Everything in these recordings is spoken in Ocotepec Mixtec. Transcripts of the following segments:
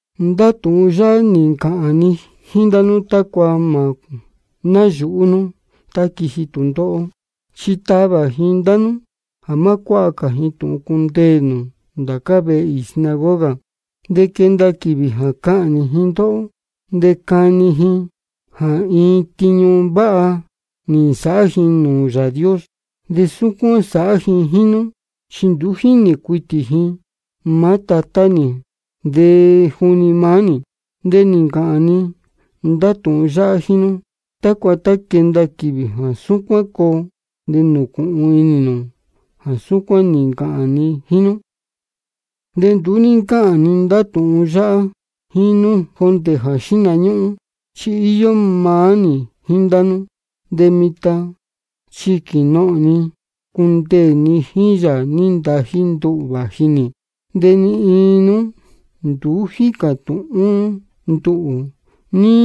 Ndá tūhun yáhá nī ncāhān ni jíín ndá nú tácua mā náyūhú nú tá quiji tūndóhó. Chi tavā ji ndá nú jā má cuáha cā ji tūhun cundeē nū ndācá vehe īī sinagoga. De quenda quīvī jā cahnī ji ndóhó, de cani inī ji jā iin tiñu váha nī nsāhá ji nūū Yāā Dios. De súcuán sāhá ji jíín nú, chi nduú jínī cuitī ji maá Tatá nī de juni maá nī. De nī ncāhān ni ndá tūhun yáhá jíín nú, tácua tá quenda quīvī jā súcuán coo, de nūcūhun inī nū jā súcuán nī ncāhān ni jíín nú. Tiñu jā sáhá Espíritu Santo De nduú ní ncáhān ni ndá tūhun yáhá jíín nú jondē jā xihna ñúhún, chi íyó maá nī jíín ndá nú. De mitan chi quīnohōn ni cundeē ni jíín Yāā nī ntají nduhū vāji nī. De ni iin nú nduú jícā tūhún nduhū ní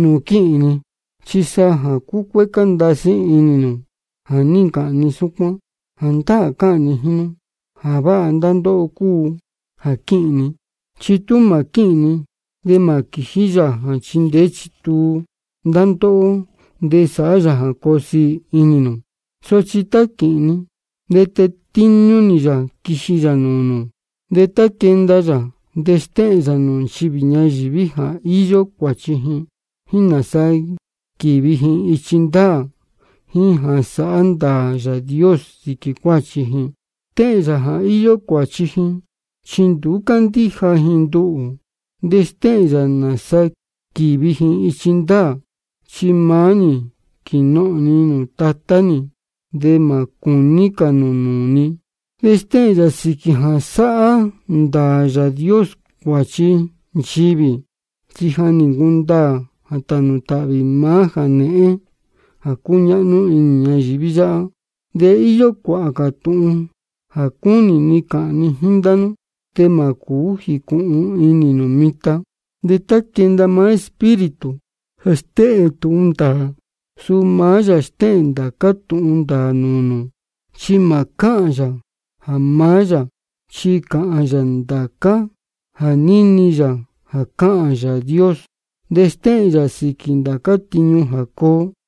nūū quíhīn ni. Chi sa jā cúcuécá ndasí inī nū jā ní ncāhān ni súcuán. Jāndáā cáhān ni jíín nú: Jā váha ndá ndóhó cúu jā quíhīn ni. Chi tú mā quíhīn ni, de mā quījí Yāā jā chindeé chituu ndá ndóhó de sāhá yā jā coo siī inī nū. Sochi tá quīhīn ni, de tetíñú nī yā quiji yā nūū nū. De tá quenda yā, de stéhēn yā nūū nchivī ñayīví jā íyó cuāchi ji, jíín nāsa quīvi ji ichi ndāā, jíín jā sāhá ndāā Yāā Dios sīquī cuāchi ji. Stéhēn yā jā íyó cuāchi ji, chi nduú cándíja ji nduhū. De stéhēn yā nāsa quīvi ji ichi ndāā, chi maá nī quīnohōn ni nūū Tatá nī, de mā cūní cā nū nūū ni. De stéhēn yā sīquī jā sāhá ndāā Yāā Dios cuāchi nchivī, chi ja nī ncundaā jā tānū tāhvī maá jānēhén jā cúñáhnú inī ñayīví yáhá. De íyó cuāhā cā tūhun jā cúnī ni cāhān ni jíín ndá nú, de mā cūú jīcūhun inī nū mitan. De tá quenda maá Espíritu jā stéhēn tūhun ndāā, suu maá yā stéhēn ndācá tūhun ndāā nūū nū. Chi mā cáhān yā jā maá yā, chi cāhān yā ndācá jā níni yā jā cáhān Yāā Dios. De stéhēn yā sīquī ndācá tiñu jā coo.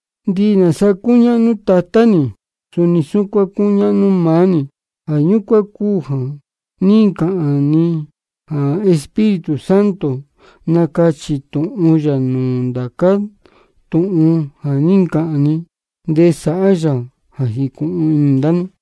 Ndihi nāsa cúñáhnú Tatá nī, suni súcuán cúñáhnú maá nī. Jā ñúcuán cúu jā ní ncāhān ni jā Espíritu Santo nacachī tūhun yā nūū nū ndācá tūhun ja nī ncāhān ni, de sāhá yā jā jīcūhun inī ndá nú.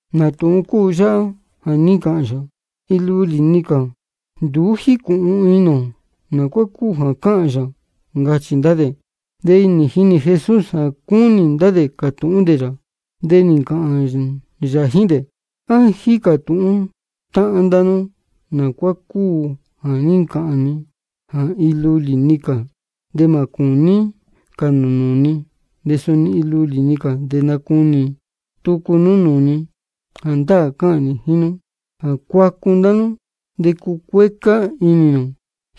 ¿Nā tūhun cúu yáhá jā ní ncāhān yā, iin lulī-ni cā? Nduú jícūhun inī ō nā cuá cúu jā cáhān yā, ncachī ndá dē. De nī jinī Jesús jā cúnī ndá dē cātūhún dē yā. De nī ncāhān yā jíín dē: ¿A jícā tūhún táhán ndá nú nā cuá cúu jā ní ncāhān ni jā iin lulī-ni cā de mā cūní cā nū nūū ni, de suni iin lulī-ni cā de nacunī tucu nú nūū ni? Jāndáā cáhān ni jíín nú jā cuacu ndá nú de cucuécá inī nū,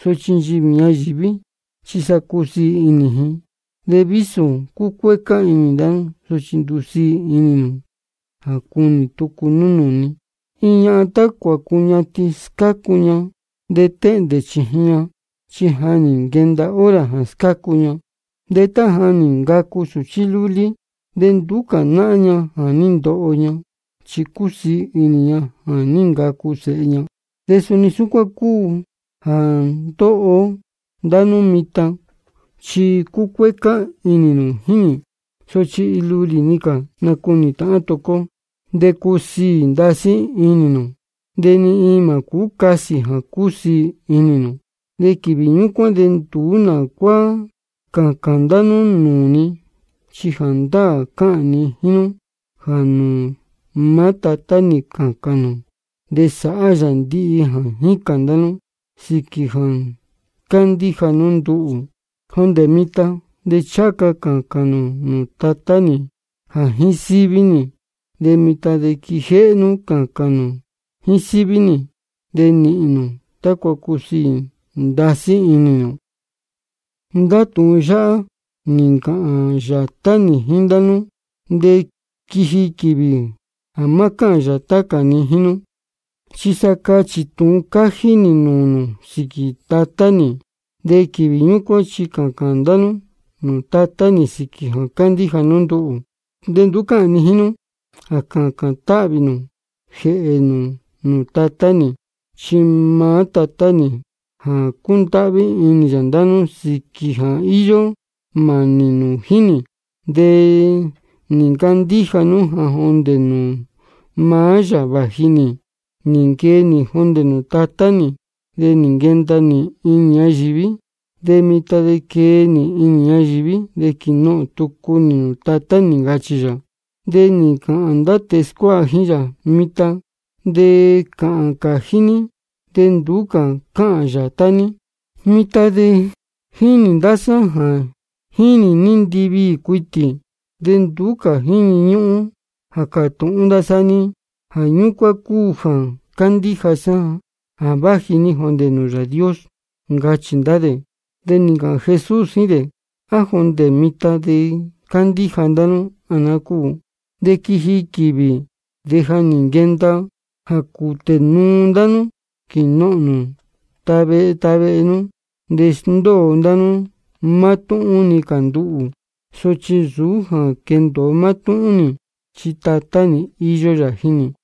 sochi nchivī ñayīví chi sa cusiī inī ji. De vísō cucuécá inī ndá nú, sochi ndusiī inī nū jā cunī tucu nú nūū ni. Iin ñahan tá cuācuñatin scácu ña, de téhndē chījin ña, chi ja nī nquenda hora jā scácu ña. De tá ja nī ncacu sūchí lúlí, de nduú cā náhán ña jā ní ndoho ña, chi cúsiī inī ña jā ní ncacu sēhe ña. De suni súcuán cúu jā ndóho ndá nú mitan, chi cúcuécá inī nū jíín nī. Sochi iin lulī-ni cā de nacunī tāhán tucu ó, de cusiī ndasí inī nū. De ni iin mā cásī jā cusiī inī nū. De quīvī ñúcuán de nduú nā cuá cācān cā ndá nú nūū ni. Chi jāndáā cáhān ni jíín nú jā nūū maá Tatá nī cācān nū, de sāhá yā ndihi jā jícān ndá nú, sīquī jā cándíja nú nduhū. Jondē mitan de ncháha ca cācān nū nūū Tatá nī jā jíín síví nī. De mitan de quijéhé nú cācān nū jíín síví nī, de nīhīn nū, tácua cusiī ndasí inī nū. Ndá tūhun yáhá nī ncāhān yātá nī jíín ndá nú. De quiji quīvī jā má cáhān yātá cā ni jíín nú, chi sa cachī tūhun cájí nī nūū nū sīquī Tatá nī. De quīvī ñúcuán chi cācān ndá nú nūū Tatá nī sīquī jā cándíja nú nduhū. De nduú cáhān ni jíín nú jā cācān táhvī ni jēhē nū nūū Tatá nī. Chi maá Tatá nī ja cúndáhví inī yā ndá nú sīquī jā íyó mānī nū jíín nī, de nī ncandíja nú jā jondē nūū maá yā vāji nī. Nī nquee nī jondē nūū Tatá nī, de nī nquenda nī inī ñayīví. De mitan de quee nī inī ñayīví, de quīnohōn tucu nī nūū Tatá nī, ncachī yā. De nī ncāhān ndá tēe scuáha jíín yā: Mitan de cáhān cājí ní, de nduú cā cáhān yātá ní. Mitan de jínī ndá sá jā jínī ní ndiviī cuitī, de nduú cā jíni ñúhún jā cātūhún ndá sá níhín. Jā ñúcuán cúu jā cándíja sá jā váji ní jondē nūū Yāā Dios, ncachī ndá dē. De nī ncāhān Jesús jíín dē: ¿A jondē mitan de cándíja ndá nú, á naá cúu? De quiji quīvī, de ja nī nquenda, jā cūtē nuu ndá nú quīnohōn nū tá vehe tá vehe nú, de sndóo ndá nú mátúhún-ni cā nduhū. Sochi nsūú jā quendōo mátúhún nī, chi Tatá nī íyó yā jíín nī.